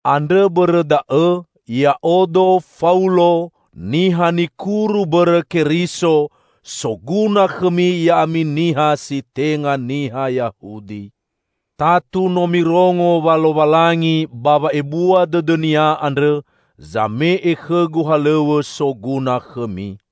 Andrõ bõrõ da'õ, ya'odo, Faulo, niha nikuru bõrõ Keriso, soguna khõmi ya'ami niha si tenga niha Yahudi. Tatu no mirongo wa Lowalangi ba wa'ebua dõdõ-Nia andrõ, zame'e khõgu halõw̃õ soguna khõmi.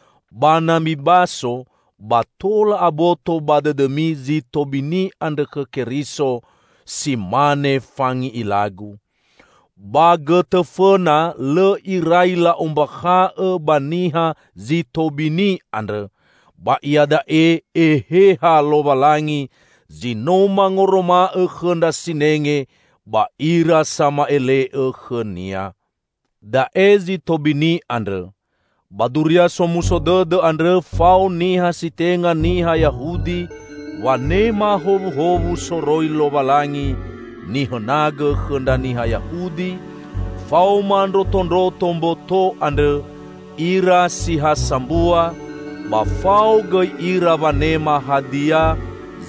ba na mibaso, ba tola aboto ba dõdõmi zi tobini andrõ khõ Keriso, si mane fangi'ilagu.) Ba gõtõ fõna lõ irai la'ombakha'õ ba niha zi tobini andrõ, ba iada'e Eheha Lowalangi zi no mangoroma'õ khõ ndra sinenge ba ira sama'ele'õ khõ-Nia. Da'e zi tobini andrõ: Ba Duria Somuso Dõdõ andrõ fao niha si tenga niha Yahudi wanema howuhowu soroi Lowalangi nihõnagõ khõ ndra niha Yahudi; faoma ndrotondroto mboto andrõ ira si ha sambua, ba fao gõi ira wanema hadia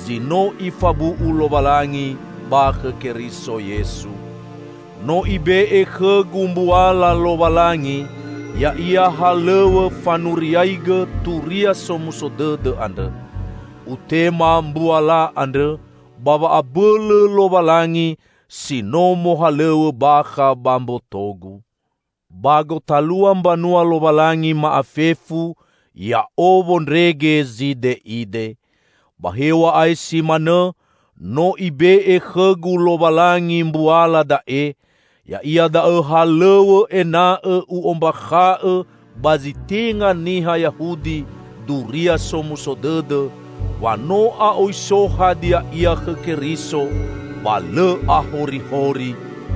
zi no Ifabu'u Lowalangi ba khõ Keriso Yesu. No Ibe'e khõgu mbuala Lowalangi -- ya'ia halõw̃õ -- fanuriaigõ Turia Somuso Dõdõ andrõ. Utema mbuala andrõ ba wa'abõlõ Lowalangi si no mohalõw̃õ bakha ba mbotogu. Ba gotalua mbanua Lowalangi ma'afefu, ya'o wondrege zide'ide. Ba hew̃a'ae si manõ no Ibe'e khõgu Lowalangi mbuala da'e; ya'ia da'õ halõw̃õ ena'õ u'ombakha'õ ba zi tenga niha Yahudi Duria Somuso Dõdõ wa no a'oi so hadia ia khõ Keriso, ba lõ ahorihori;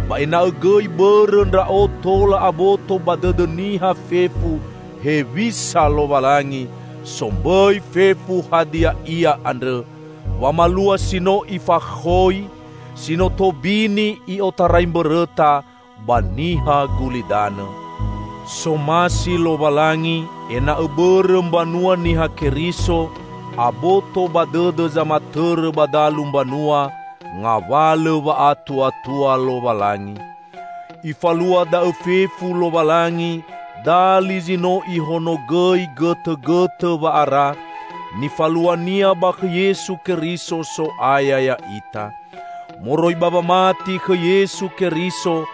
ba ena'õ gõi bõrõ ndra'o tola aboto ba dõdõ niha fefu hewisa Lowalangi, sombõi fefu hadia ia andrõ, wamalua si no Ifakhõi, si no tobini i'otarai mbõrõta ba niha gulidanõ. Somasi Lowalangi, ena'õ bõrõ mbanua Niha Keriso, aboto ba dõdõ zamatõrõ ba dalu mbanua ngawalõ wa'atuatua Lowalangi. Ifalua da'õ fefu Lowalangi dali zi no Ihonogõi gõtõgõtõ wa'ara, nifalua-Nia ba khõ Yesu Keriso, So'aya ya'ita. Moroi ba wamati khõ Yesu Keriso,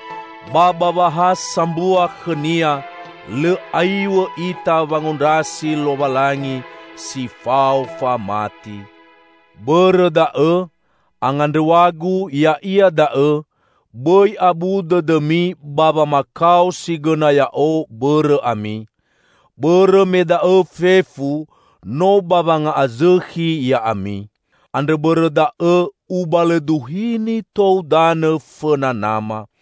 ba ba wa ha sambua khõ-Nia, lõ aiw̃õ ita wangondrasi Lowalangi si fao famati. Bõrõ da'õ, angandrõw̃agu ya'ia da'õ: bõi abu dõdõmi ba wamakao si gõna ya'o, bõrõ ami; bõrõ me da'õ fefu, no ba wanga'azõkhi ya'ami. Andrõ bõrõ da'õ ubalõduhini tou danõ fõna Nama.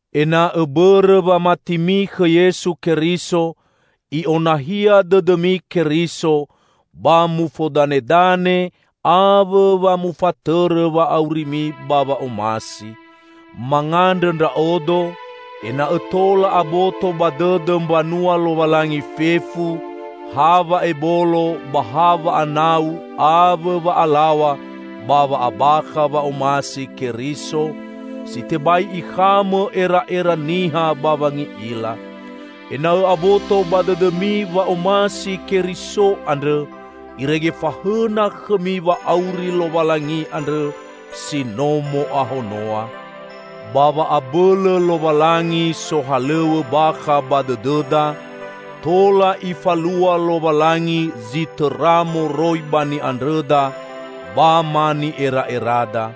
Ena'õ bõrõ wamatimi khõ Yesu Keriso, I'onahia dõdõmi Keriso, ba mufodanedane awõ wa mufatõrõ wa'aurimi ba wa'omasi. Mangandrõ ndra'odo, ena'õ tola aboto ba dõdõ mbanua Lowalangi fefu, ha wa'ebolo ba ha wa'anau awõ wa'alaw̃a ba wa'abakha wa'omasi Keriso, si tebai ikhamõ era'era niha ba wangi'ila. Ena'õ aboto ba dõdõmi wa'omasi Keriso andrõ, irege fahõna khõmi wa'auri Lowalangi andrõ si no mo'ahonoa. Ba wa'abõlõ Lowalangi sohalõw̃õ bakha ba dõdõda, tola Ifalua Lowalangi zi tõra moroi ba ni'andrõda, ba ma ni'era'erada.